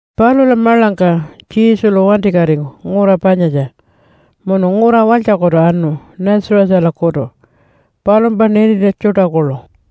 Palula maḻangka Jesulu wantikatingu ngura panyatja, munu ngura walytjakutu anu Nazarethalakutu palumpa nintintja tjuṯa kuḻu.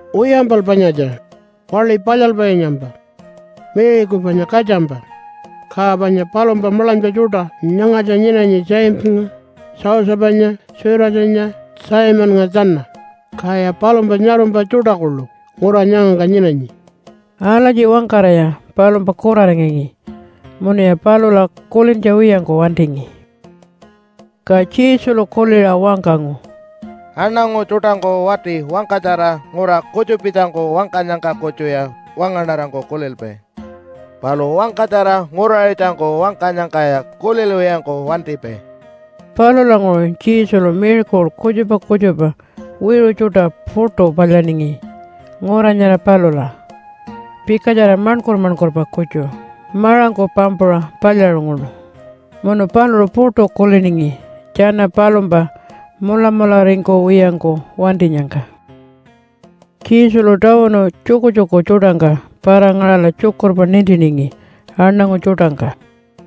Wiyampal panyatja waḻi palyalpainyampa, Maryku panya katjampa. Ka panya palumpa maḻanypa tjuṯa nyangatja nyinanyi Jamesanya, Josephanya, Judasanya, Simonnga tjana, kaya palumpa nyarumpa tjuṯa kuḻu ngura nyangangka nyinanyi.” Alatji wangkaraya palumpa kuraringangi munuya palula kulintja wiyangku wantingi. Ka Jesulu kuliṟa wangkangu, “Aṉangu tjuṯangku wati wangkatjara ngura kutjupitjangku wangkanyangka kutjuya wangaṉarangku kulilpai, palu wangkatjara nguraṟitjangku wangkanyangkaya kulilwiyangku wantipai.” Palulanguṟu Jesulu miracle kutjupa kutjupa wiṟu tjuṯa puṯu palyaningi ngura nyara palula, pikatjara maṉkur-maṉkurpa kutju maṟangku pampuṟa palyaṟunguṉu. Munu paluṟu puṯu kuliningi tjana palumpa mulamularingkuwiyangku wantinyangka. Jesulu tawunu tjukutjuku tjuṯangka para-ngaṟala tjukurpa nintiningi aṉangu tjuṯangka.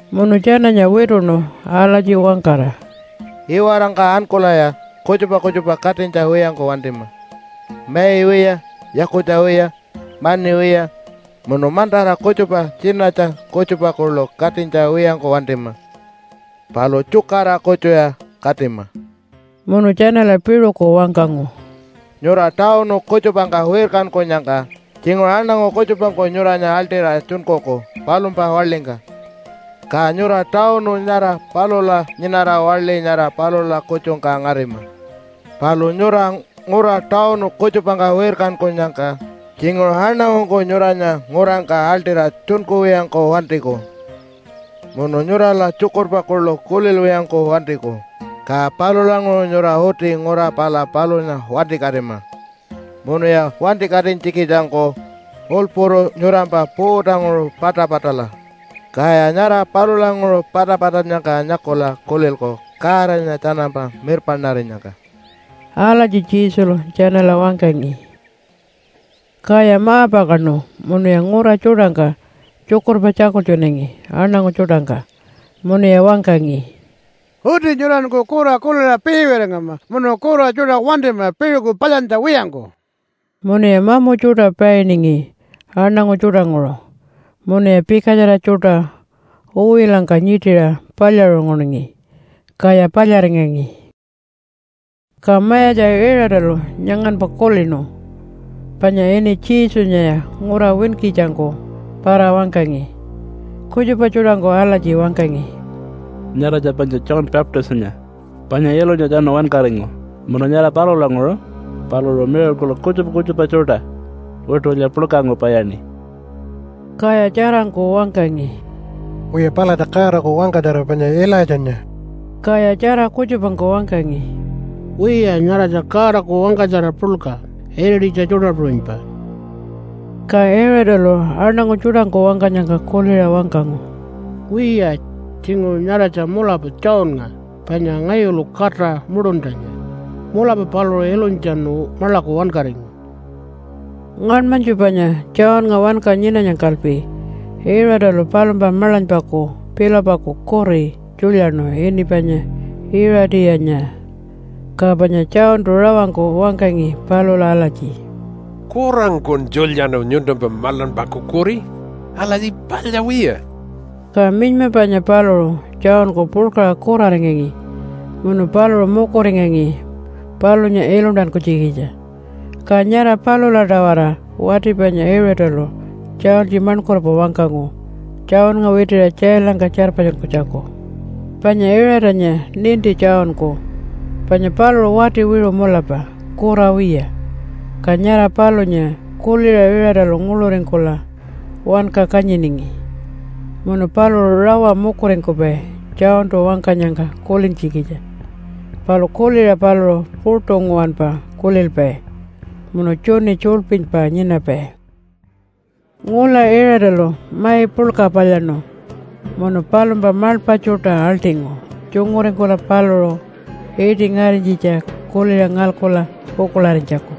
Munu tjananya wituṉu alatji wangkara, “Iwarangka ankulaya kutjupa kutjupa katinytja wiyangku wantima, mai wiya, yakutja wiya, mani wiya munu mantara kutjupa tjinatja kutjupa kuḻu katinytja wiyangku wantima. Palu tjukara kutjuya katima.” Munu tjanala piṟuku wangkangu, “Nyura tawunu kutjupangka wirkankunyangka tjinguṟu aṉangu kutjupangku nyuranya aḻṯira tjunkuku palumpa waḻingka. Ka nyura tawunu nyara palula nyinara waḻi nyara palula kutjungka ngarima. Palu nyura ngura tawunu kutjupangka wirkankunyangka tjinguṟu aṉangungku nyuranya ngurangka aḻṯira tjunkuwiyangku wantiku munu nyurala tjukurpa kuḻu kulilwiyangku wantiku. Ka palulanguṟu nyura uti ngura pala palunya wantikatima munuya wantikatinytjikitjangku ulpuru nyurampa puutanguṟu patapatala, kaya nyara palulanguṟu patapatannyangka nyakula kulilku Godanya tjanampa mirpaṉarinyangka.” Alatji Jesulu tjanala wangkangi. Kaya ma-pakaṉu munuya ngura tjuṯangka tjukurpa tjakultjunangi aṉangu tjuṯangka, munuya wangkangi, “Uti nyuranku kura kuliṟa piiwiyaringama munu kura tjuṯa wantima piṟuku palyantja wiyangku.” Munuya mamu tjuṯa painingi aṉangu tjuṯanguṟu, munuya pikatjara tjuṯa uwilangka nyiṯiṟa palyaṟunguningi, kaya palyaringangi. Ka Mayatja Iṟatalu nyanganpa kulinu, panya ini Jesunyaya ngura winkitjangku para-wangkangi. Kutjupa tjuṯangku alatji wangkangi, “Nyaratja panya John Baptistanya panya ilunytjatjanu wankaringu munu nyara palulanguṟu paluṟu miracle kutjupa kutjupa tjuṯa witulya puḻkangku palyaṉi.” Kaya tjarangku wangkangi, “Wiya palatja Godaku wangkatjara panya Ilaitjanya.” Kaya tjara kutjupangku wangkangi, “Wiya, nyaratja Godaku wangkatjara puḻka irititja tjuṯa puṟunypa.” Ka Iṟatalu aṉangu tjuṯangku wangkanyangka kuliṟa wangkangu, “Wiya tjinguṟu nyaratja mulapa Johnnga, panya ngayulu kata muṯuntjanya. Mulapa paluṟu ilunytjatjanu maḻaku wankaringu.” Ngaṉmanytju panya Johnnga wanka nyinanyangkalpi Iṟatalu palumpa maḻanypaku Philipaku kuri tjulyaṉu ini panya Iṟatiyanya. Ka panya Johntu rawangku wangkangi palula alatji, “Kurangkun tjulyaṉu nyuntumpa maḻanypaku kuri. Alatji palya wiya.” Ka minyma panya paluṟu Johnku puḻkaṟa kuraringangi munu paluṟu mukuringangi palunya iluntankunytjikitja. Ka nyara palula-tawara wati panya Iṟatalu tjaultji maṉkurpa wangkangu Johnnga witiṟa tjailangka tjarpatjunkunytjaku. Panya Iṟatanya ninti Johnku, panya paluṟu wati wiṟu mulapa kura wiya, ka nyara palunya kuliṟa Iṟatalu nguḻuringkula wanka kanyiningi. Munu paluṟu rawa mukuringkupai Johntu wangkanyangka kulintjikitja, palu kuliṟa paluṟu puṯu nguwanpa kulilpai munu tjuni tjulypilypa nyinapai. Ngula Iṟatalu mai puḻka palyaṉu munu palumpa maḻpa tjuṯa aḻṯingu tjunguringkula paluṟu iṯi ngarinytjitja kuliṟa ngalkula pukuḻarinytjaku.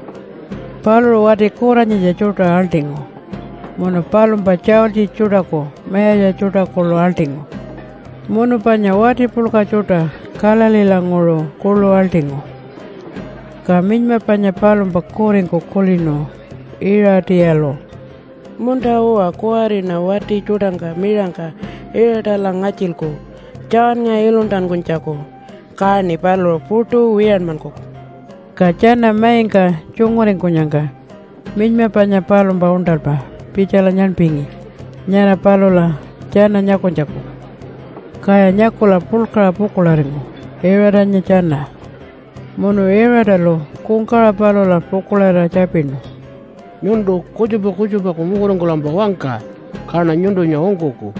Paluṟu wati kuranyitja tjuṯa aḻṯingu, munu palumpa tjaultji tjuṯaku mayatja tjuṯa kuḻu aḻṯingu, munu panya wati puḻka tjuṯa Galileelanguṟu kuḻu aḻṯingu. Ka minyma panya palumpa kuringku kulinu Iṟatiyalu, “Munta-uwa, kuwariṉa wati tjuṯangka miṟangka Iṟatala ngatjilku Johnnga iluntankunytjaku, kaṉi paluṟu puṯu wiyanmankuku.” Ka tjana maingka tjunguringkunyangka minyma panya palumpa uṉṯalpa pitjala nyaṉpingi nyara palula tjana nyakunytjaku. Kaya nyakula puḻkaṟa pukuḻaringu Iṟatanya tjana. Munu Iṟatalu kungkawaṟa palula pukuḻarira tjapinu, “Nyuntu kutjupa kutjupaku mukuringkulampa wangka, kaṉa nyuntunya ungkuku.”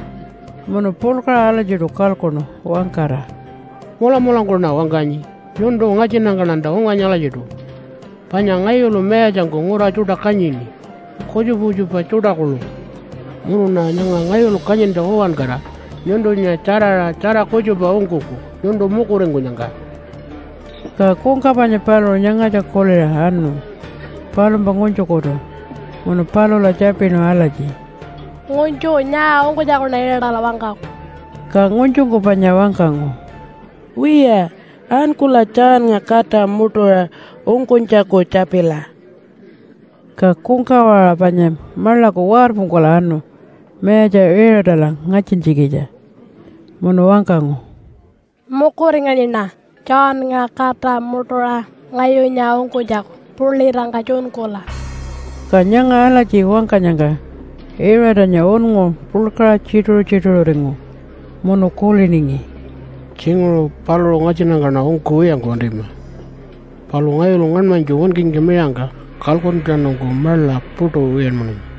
Munu puḻkaṟa alatjiṯu kalkuṉu wangkara, “Mulamulangkuṉa wangkanyi. Nyuntu ngatjinnyangkaṉanta unganyi alatjiṯu. Panya ngayulu mayatjangku ngura tjuṯa kanyini kutjupa kutjupa tjuṯa kuḻu. Munuṉa nyanga ngayulu kanyintja uwankara nyuntunya tjaraṟa tjara kutjupa ungkuku nyuntu mukuringkunyangka.” Ka kungka panya paluṟu nyangatja kuliṟa anu palumpa ngunytjukutu munu palula tjapinu alatji, “Ngunytju, nyaa ungkunytjakuṉa Iṟatala wangkaku?” Ka ngunytjungku panya wangkangu, “Wiya, ankula Johnnga kata muṯuṟa ungkunytjaku tjapila.” Ka kungkawaṟa panya maḻaku warpungkula anu mayatja Iṟatala ngatjintjikitja munu wangkangu, “Mukuringanyiṉa Johnnga kata muṯuṟa ngayunya ungkunytjaku pulitangka tjunkula.” Ka nyanga alatji wangkanyangka Iṟatanya unngu puḻkaṟa tjituṟu-tjituṟuringu, munu kuliningi, “Tjinguṟu paluṟu ngatjinnyangkaṉa ungkuwiyangku wantima, palu ngayulu ngaṉmanytju winkingka miṟangka kalkuntjatjanungku maḻa puṯu wiyanmananyi.”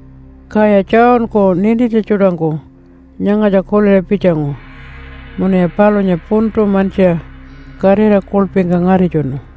Kaya Johnku nintintja tjuṯangku nyangatja kuliṟa pitjangu munuya palunya puntu mantjiṟa katira kuḻpingka ngaritjunu.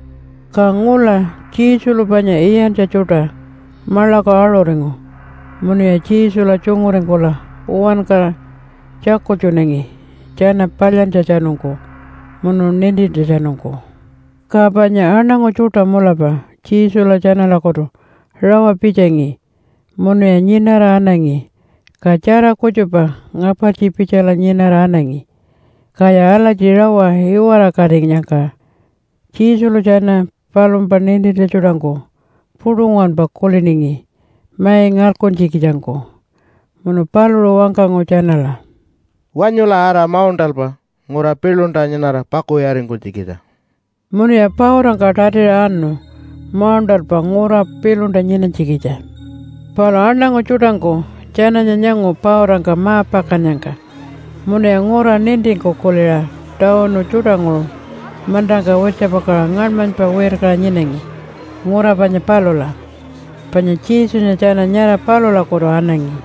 Ka ngula Jesulu panya iyantja tjuṯa maḻaku aṟuringu munuya Jesula tjunguringkula uwankara tjakultjunangi tjana palyantjatjanungku munu nintintjatjanungku. Ka panya aṉangu tjuṯa mulapa Jesula tjanalakutu rawa pitjangi munuya nyinara anangi, ka tjara kutjupa ngapartji pitjala nyinara anangi. Kaya alatji rawa iwarakatinyangka Jesulu tjana palumpa nintintja tjuṯangku puṯu nguwanpa kuliningi mai ngalkuntjikitjangku munu paluṟu wangkangu tjanala, “Wanyula ara mauṉṯalpa ngura piḻunta nyinara pakuwiyaringkunytjikitja.” Munuya pautangka tatiṟa anu mauṉṯalpa ngura piḻunta nyinanytjikitja. Palu aṉangu tjuṯangku tjananya nyangu pautangka ma-pakannyangka munuya ngura nintingku kuliṟa tawunu tjuṯanguṟu mantangka wirtjapakaṟa ngaṉmanypa wirkaṟa nyinangi ngura panya palula, panya Jesunya tjana nyara palulakutu anangi.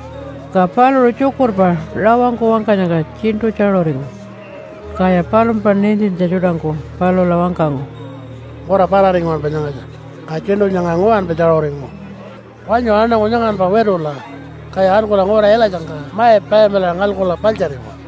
Ka paluṟu tjukurpa rawangku wangkanyangka tjiṉṯu tjaṟuringu kaya palumpa nintintja tjuṯangku palula wangkangu, “Ngura parari nguwanpa nyangatja, ka tjiṉṯu nyanga nguwanpa tjaṟuringu. Wanyu aṉangu nyanganpa witula kaya ankula ngura ilatjangka mai payamilaṟa ngalkula paḻtjariwa.”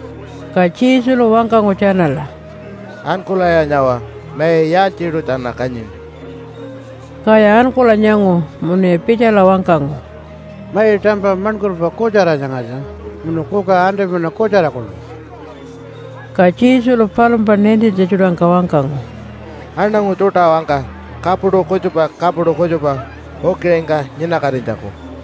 Ka Jesulu wangkangu tjanala, “Ankulaya nyawa mai yaaltjiṯu tjana kanyini.” Kaya ankula nyangu munuya pitjala wangkangu, “Mai tampa maṉkurpa kutjara nyangatja, munu kuka antipina kutjara kuḻu.” Ka Jesulu palumpa nintintja tjuṯangka wangkangu, “Aṉangu tjuṯa wangka kapuṯu kutjupa kapuṯu kutjupa ukiṟingka nyinakatinytjaku.”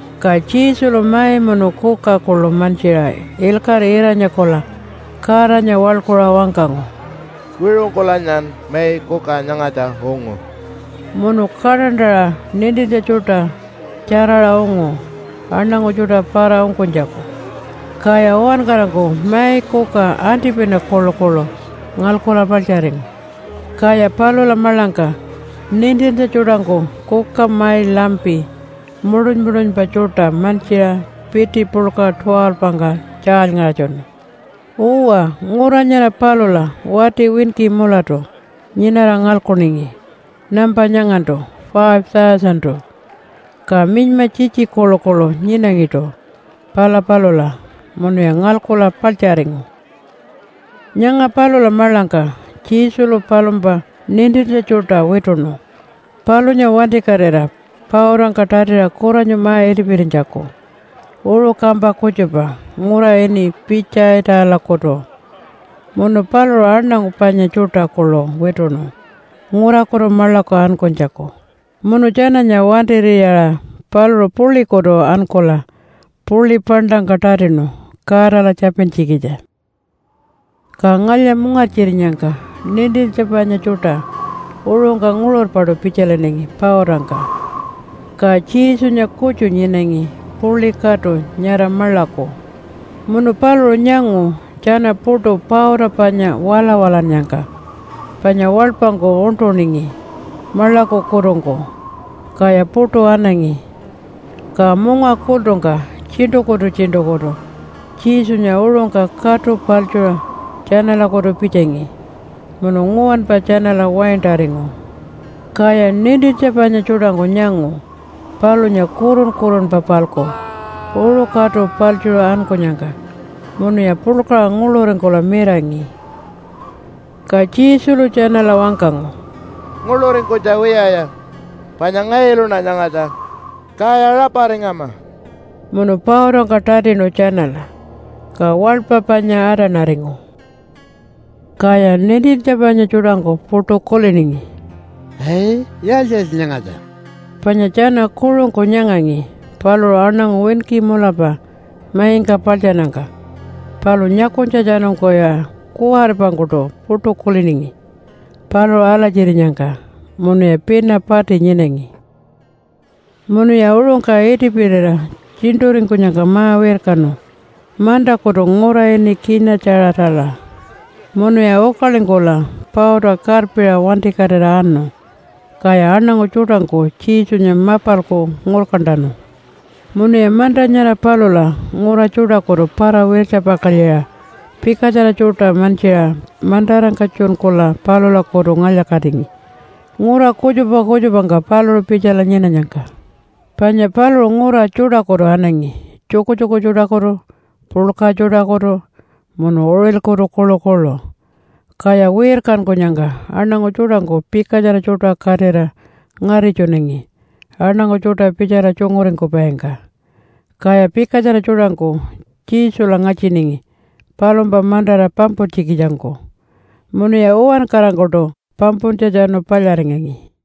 Ka Jesulu mai munu kuka kuḻu mantjiṟa ilkaṟi ira-nyakula Godanya waḻkuṟa wangkangu, “Wiṟungkulanyan mai kuka nyangatja ungu.” Munu kaṯantaṟa nintintja tjuṯa tjaraṟa ungu aṉangu tjuṯa para-ungkunytjaku, kaya uwankarangku mai kuka antipina kuḻukuḻu ngalkula paḻtjaringu. Kaya palula maḻangka nintintja tjuṯangku kuka mai lampi muṯun-muṯunpa tjuṯa mantjiṟa piti puḻka 12-ngka tjaalyngaṟatjunu. Uwa, ngura nyara palula wati winki mulatu nyinara ngalkuningi nampa nyangantu 5,000-tu. Ka minyma tjitji kuḻukuḻu nyinangiṯu pala palula munuya ngalkula paḻtjaringu. Nyanga palula maḻangka Jesulu palumpa nintintja tjuṯa wituṉu palunya wantikatira pautangka tatiṟa kuranyu ma-itipirinytjaku uṟu kampa kutjupa ngura ini Pitjaitalakutu. Munu paluṟu aṉangu panya tjuṯa kuḻu wituṉu ngurakutu maḻaku ankunytjaku. Munu tjananya wantir'iyaṟa paluṟu puḻikutu ankula puḻi paṉṯangka tatinu Godala tjapintjikitja. Ka ngalya-mungartjirinyangka nintintja panya tjuṯa uṟungka nguṟurpaṯu pitjalinangi pautangka, ka Jesunya kutju nyinangi puḻi katu nyara maḻaku. Munu paluṟu nyangu tjana puṯu pauta panya walawalannyangka, panya waḻpangku uṉṯuningi maḻakukutungku, kaya puṯu anangi. Ka munga kultungka tjiṉṯukutu-tjiṉṯukutu Jesunya uṟungka katu paḻtjuṟa tjanalakutu pitjangi. Munu nguwanpa tjanala waintaringu. Kaya nintintja panya tjuṯangku nyangu palunya kurun-kurunpa-palku uṟu katu paḻtjuṟa ankunyangka munuya puḻkaṟa nguḻuringkula mirangi. Ka Jesulu tjanala wangkangu, “Nguḻuringkunytja wiyaya panya ngayuluṉa nyangatja, kaya raparingama!” Munu pautangka tatinu tjanala. Ka waḻpa panya atanaringu. Kaya nintintja panya tjuṯangku puṯu kuliningi, “Ai, yaaltji-yaaltji nyangatja?” Panya tjana kuṟungku nyangangi paluṟu aṉangu winki mulapa maingka paḻtjannyangka palu nyakunytjatjanungkuya kuwaripangkuṯu puṯu kuliningi paluṟu alatjirinyangka, munuya pina pati nyinangi. Munuya uṟungka itipirira tjiṉṯuringkunyangka ma-wirkanu mantakutu ngura ini Kina-tjaṟatala. Munuya ukalingkula pauta karpiṟa wantikatira anu. Kaya aṉangu tjuṯangku Jesunya mapalku ngurkantanu. Munuya manta nyara palula ngura tjuṯakutu para-wirtjapakalyiṟa pikatjara tjuṯa mantjiṟa mantarangka tjunkula palulakutu ngalya-katingi ngura kutjupa kutjupangka paluṟu pitjala nyinanyangka. Panya paluṟu ngura tjuṯakutu anangi, tjukutjuku tjuṯakutu, puḻka tjuṯakutu, munu uṟilkutu kuḻukuḻu, kaya wirkankunyangka aṉangu tjuṯangku pikatjara tjuṯa katira ngaritjunangi aṉangu tjuṯa pitjala tjunguringkupaingka. Kaya pikatjara tjuṯangku Jesula ngatjiningi palumpa mantara pampuntjikitjangku, munuya uwankarangkuṯu pampuntjatjanu palyaringangi.